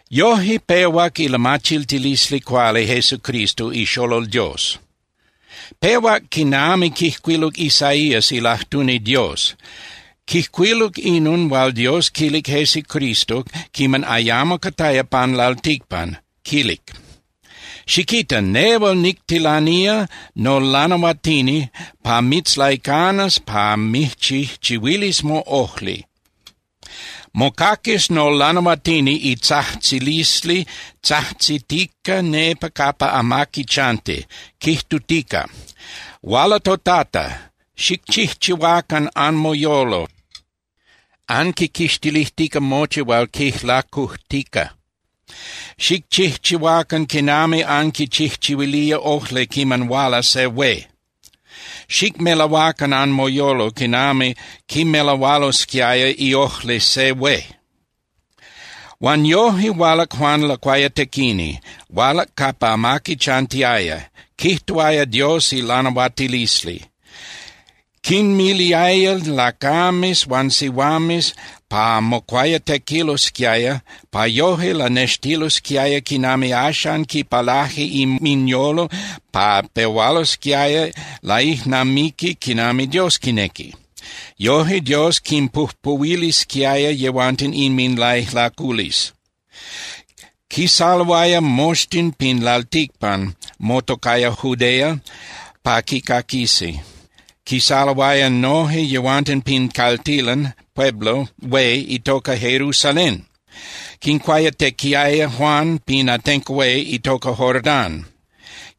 Yoje pehuac ilamachiltilisli cuali Jesucristo iXolol Dios. Pehuac quinami quijcuiluc Isaías ilajtuni Dios, quijcuiluc inon hual Dios quilic Jesucristo quiman ayamo cataya pan lalticpan, quilic: Xiquita, nehual nictilanía nolanahuatini pa mitzlaicanas pa mijchijchihuilis moꞌojli. Mocaquis nolanahuatini itzajtzilisli tzajtzitica nepa capa amaqui chanti, quijtutica: “Huala toTata. Xicchijchihuacan anmoyolo anquiquixtilijtica mochi hual quijlacujtica. Xicchijchihuacan quinami anquichijchihuilía ojli quiman huala se hué. Xicmelahuacan anmoyolo quinami quimelahualosquiaya iojli se hué.” Huan yoje hualac Juan Lacuayatequini, hualac capa amaqui chantiaya, quijtuaya Dios ilanahuatilisli. Quinmiliaya lacames huan sihuames pa mocuayatequilosquiaya pa yoje lanextililosquiaya quinami axan quipalaje inminyolo pa pehualosquiaya laijnamiqui quinami Dios quinequi. Yoje Dios quinpujpuhuilisquiaya yehuanten inminlaijlaculisli. Quisaloaya moxtin pin lalticpan motocaya Judea pa quicaquisi. Quisaloaya noje yehuanten pin caltilan (pueblo) hué itoca Jerusalén. Quincuayatequiaya Juan pin atenco hué itoca Jordán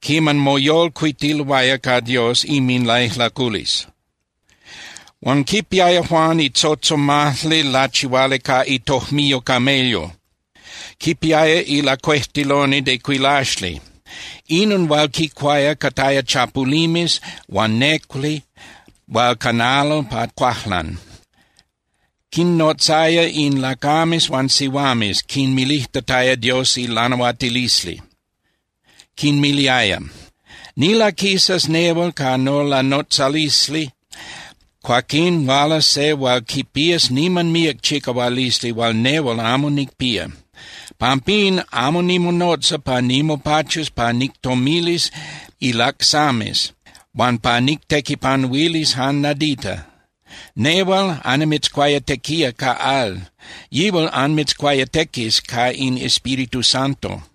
quiman moyolcuitiloaya ca Dios inminlaijlaculisli. Huan quipiaya Juan itzotzomajli lachihuali ca itojmiyo camello. Quipiaya ilacuejtiloni de cuilaxli. Inon hual quicuaya cataya chapulimes huan néculi hual canalo pa cuajlan. Quinnotzaya in lacames huan sihuames, quinmilijtataya Dios ilanahuatilisli. Quinmiliaya: —Nilaquisas nehual ca nolanotzalisli, cuaquín hualas se hual quipías niman míac chicahualisli hual nehual amo nicpía. Pampín amo nimonotza pa nimopachus pa nictomilis ilacsames huan pa nictequipanuilis jan nadita. Nehual annimitzcuayatequía ca al. Yihual anmitzcuayatequis ca in Espíritu Santo.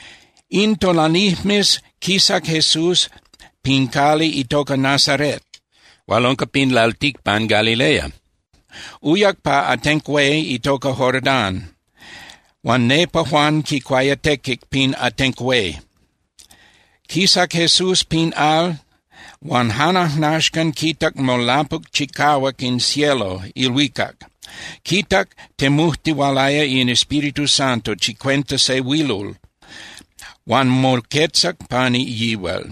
In tonalijmes quisac Jesús pin cali itoca Nazaret hual unca pin lalticpan Galilea. Uyac pa atenco hué itoca Jordán, huan nepa Juan quicuayatequic pin atenco hué. Quisac Jesús pin al, huan jan ajnaxcan quitac molapuc chicahuac in cielo (ilhuicac), quitac temujtihualaya in Espíritu Santo chicuenta se huilol huan moquetzac pani yihual.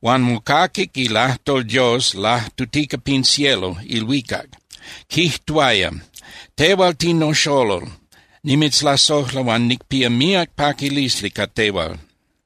Huan mocaquic ilajtol Dios lajtutica pin cielo (ilhuicac), quijtuaya: —Tehual tinoxolol. Nimitzlasojla huan nicpía míac paquilisli ca tehual.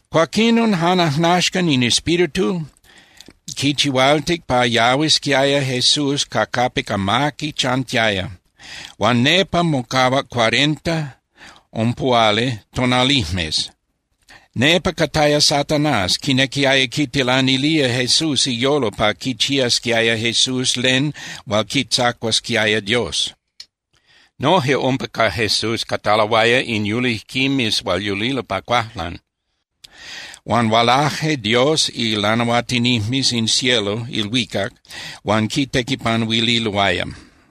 Cuaquinon jan ajnaxcan in Espíritu quichihualtic pa yahuisquiaya Jesús ca capic amaqui chantiaya. Huan nepa mocahuac cuarenta (ompuhuali) tonalijmes. Nepa cataya Satanás, quinequiaya quitilanilía Jesús iyolo pa quichiasquiaya Jesús len hual quitzacuasquiaya Dios. Noje umpa ca Jesús cataloaya in yulijquimes hual yulilo pa cuajlan. Huan hualaje Dios ilanahuatinijmes in cielo (ilhuicac) huan quitequipanuililoaya.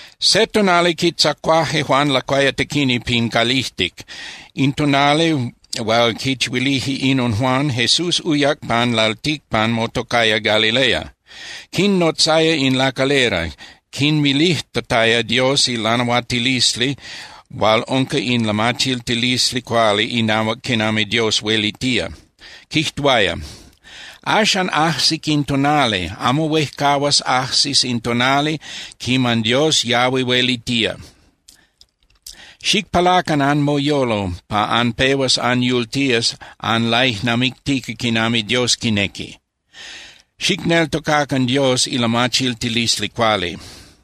Se tonali quitzacuaje Juan Lacuayatequini pin calijtic. In tonali hual quichihuilije inon Juan, Jesús uyac pan lalticpan motocaya Galilea. Quinnotzaya in lacalera, quinmilijtataya Dios ilanahuatilisli hual unca in lamachiltilisli cuali inahuac quinami Dios huelitía. Quijtuaya: —Axan ajsic in tonali, amo huejcahuas in tonali quiman Dios yahui huelitía. Xicpalacan anmoyolo pa anpehuas anyultías anlaijnamictica quinami Dios quinequi. Xicneltocacan Dios ilamachiltilisli cuali.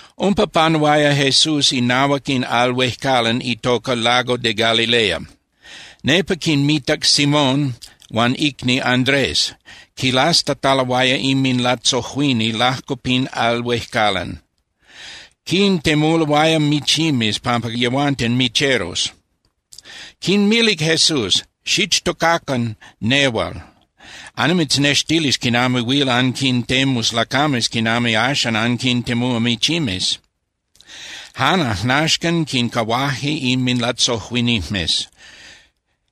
Umpa panuaya Jesús inahuac in al huejcalan itoca Lago de Galilea. Nepa quinmitac Simón huan icni Andrés, quilastataloaya inminlatzojuini lajco pin al huejcalan. Quintemuloaya michimes pampa yehuanten micheros. Quinmilic Jesús: —Xichtocacan nehual. Annimitznextilis quinami huil anquintemus lacames quinami axan anquintemúa michimes. Jan ajnaxcan quincahuaje inminlatzojuinijmes,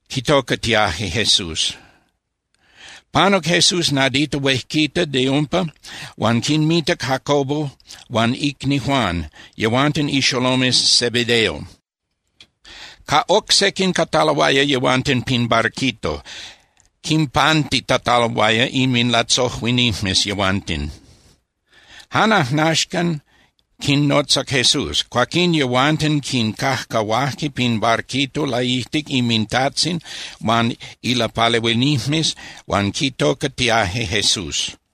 quitocatiaje Jesús. Panuc Jesús nadita huejquita de umpa huan quinmitac Jacobo huan icni Juan, yehuanten ixolomes Zebedeo. Ca oc sequin cataloaya yehuanten pin barquito, quinpantitataloaya inminlatzojuinijmes yehuanten. Jan ajnaxcan quinnotzac Jesús. Cuaquín yehuanten quincajcahuaje pin barquito laijtic inmintajtzin huan ilapalehuinijmes huan quitocatiaje Jesús.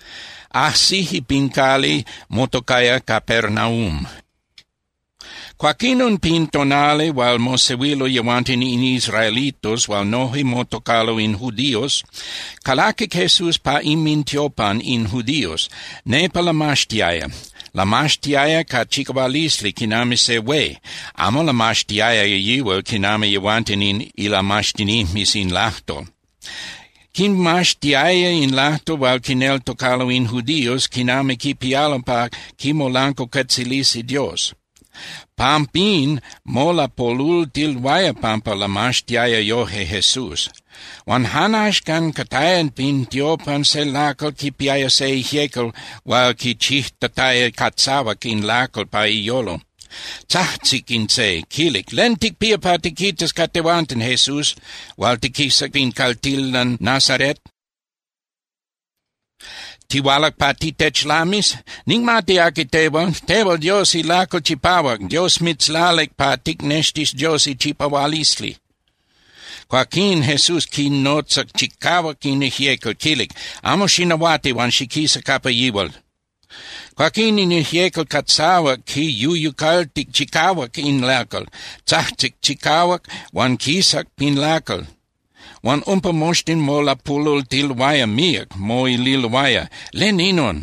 Ajsije pin cali motocaya Capernaum. Cuaquinon pin tonali hual mosehuilo yehuanten in israelitos hual noje motocalo in judíos, calaquic Jesús pa inmintiopan in judíos, nepa lamaxtiaya. Lamaxtiaya ca chicahualisli quinami se hué. Amo lamaxtiaya yihual quinami yehuanten in ilamaxtinijmes in lajtol. Quimaxtiaya in lajtol hual quineltocalo in judíos quinami quipialo pa quimolancuacuetzilisi Dios. Pampín molapolultiloaya pampa lamaxtiaya yoje Jesús. Huan jan axcan cataya pin tiopan se lacal quipiaya se ijyecal hual quichijtataya catzahuac in lacal pa iyolo. Tzajtzic in se, quilic: —¿Len ticpía pa tiquitas ca tehuanten, Jesús hual tiquisac pin caltilan Nazaret? ¿Tihualac pa titechlamis? Nicmati aqui tehual. Tehual Dios ilacal chipahuac, Dios mitzlalic pa ticnextis Dios ichipahualisli. Cuaquín Jesús quinotzac chicahuac in ijyecal, quilic: —¡Amo xinahuati huan xiquisa capa yihual! Cuaquín in ijyecal catzahuac quiyuyucaltic chicahuac in lacal, tzajtzic chicahuac huan quisac pin lacal. Huan umpa moxtin molapolultiloaya míac, moililoaya: —¿Len inon?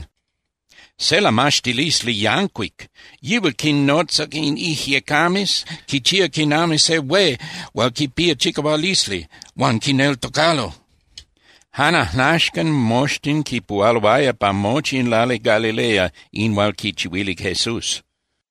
¡Se lamaxtilisli yancuic! ¡Yihual quinnotza in ijyecames, quichía quinami se hué hual quipía chicahualisli! ¡Huan quineltocalo! Jan ajnaxcan moxtin quipuhualoaya pa mochi in lali Galilea in hual quichihuilic Jesús.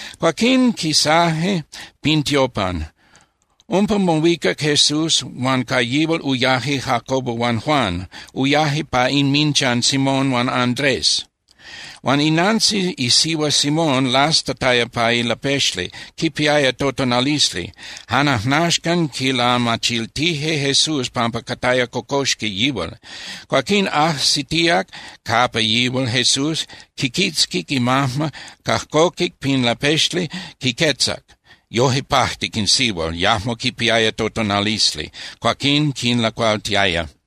Cuaquín quisaje pin tiopan. Umpa mohuicac Jesús, huan ca yihual uyaje Jacobo huan Juan. Uyaje pa inminchan Simón huan Andrés. Huan inantzin isihua Simón lastataya pa ilapexli, quipiaya totonalisli. Jan ajnaxcan quilamachiltije Jesús pampa cataya cocoxqui yihual. Cuaquín ajsitíac capa yihual Jesús, quiquitzquic imajma, cajcoquic pin lapexli, quiquetzac. Yoje pajtic in sihual, yajmo quipiaya totonalisli. Cuaquín quinlacualtiaya.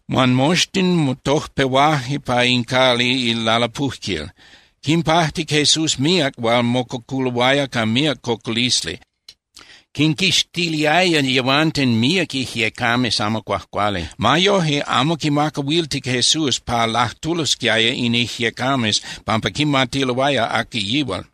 Huan moxtin motojpehuaje pa in cali ilalapujquil. Quinpajtic Jesús míac hual mococuloaya ca míac cocolisli. Quinquixtiliaya yehuanten míac ijyecames amo cuajcuali. Ma yoje, amo quinmacahuiltic Jesús pa lajtulosquiaya in ijyecames pampa quimatiloaya aqui yihual.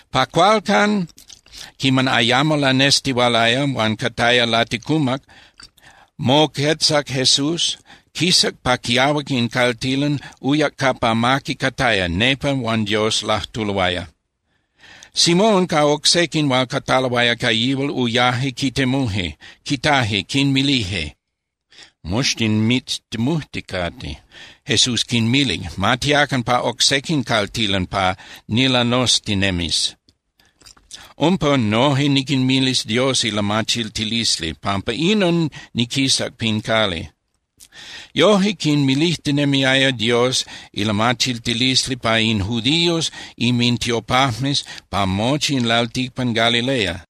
Pa cualcan quiman ayamo lanestihualaya huan cataya laticumac, moquetzac Jesús. Quisac pa quiahuac in caltilan, uyac capa amaqui cataya, nepa huan Dios lajtuloaya. Simón ca oc sequin hual cataloaya ca yihual uyaje quitemuje. Quitaje, quinmilije: —Moxtin mitztemujticate. Jesús quinmilic: —Ma tiacan pa oc sequin caltilan pa nilanoztinemis. Umpa noje niquinmilis Dios ilamachiltilisli. Pampa inon niquisac pin cali. Yoje quinmilijtinemiaya Dios ilamachiltilisli pa in judíos inmintiopajmes pa mochi in lalticpan Galilea.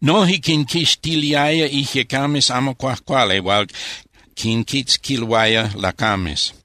Noje quinquixtiliaya ijyecames amo cuajcuali hual quinquitzquiloaya lacames.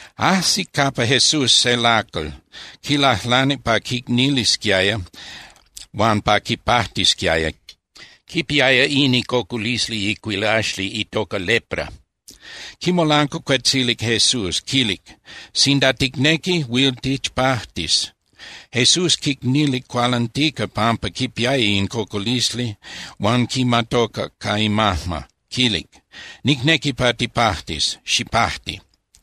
Ajsic capa Jesús se lacal, quilajlanic pa quicnilisquiaya huan pa quipajtisquiaya. Quipiaya in icocolisli icuilaxli itoca lepra. Quimolancuacuetzilic Jesús, quilic: —Sinda ticnequi, huil tichpajtis. Jesús quicnilic cualantica pampa quipiaya in cocolisli huan quimatocac ca imajma, quilic: —Nicnequi pa tipajtis. Xipajti.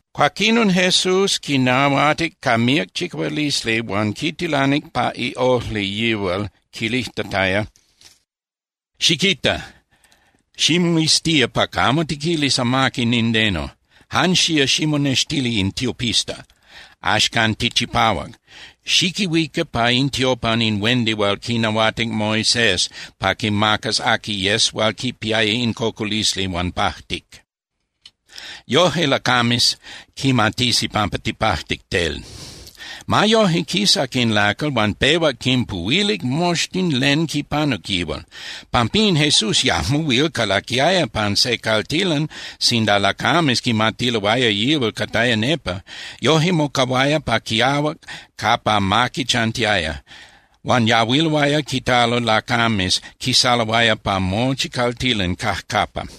Cuaquinon Jesús quinahuatic ca míac chicahualisli huan quitilanic pa iojli yihual, quilijtataya: —Xiquita. Ximoiztía pa camo tiquilis amaqui nindeno. Jan xía ximonextili in tiopista. Axcan tichipahuac. Xiquihuica pa in tiopan in huendi hual quinahuatic Moisés pa quimacas aqui yes hual quipiaya in cocolisli huan pajtic. Yoje lacames quimatisi pampa tipajtic tel. Ma yoje, quisac in lacal huan pehuac quinpuhuilic moxtin len quipanuc yihual. Pampín Jesús yajmo huil calaquiaya pan se caltilan sinda lacames quimatiloaya yihual cataya nepa. Yoje mocahuaya pa quiahuac capa amaqui chantiaya. Huan yahuiloaya quitalo lacames, quisaloaya pa mochi caltilan cajcapa.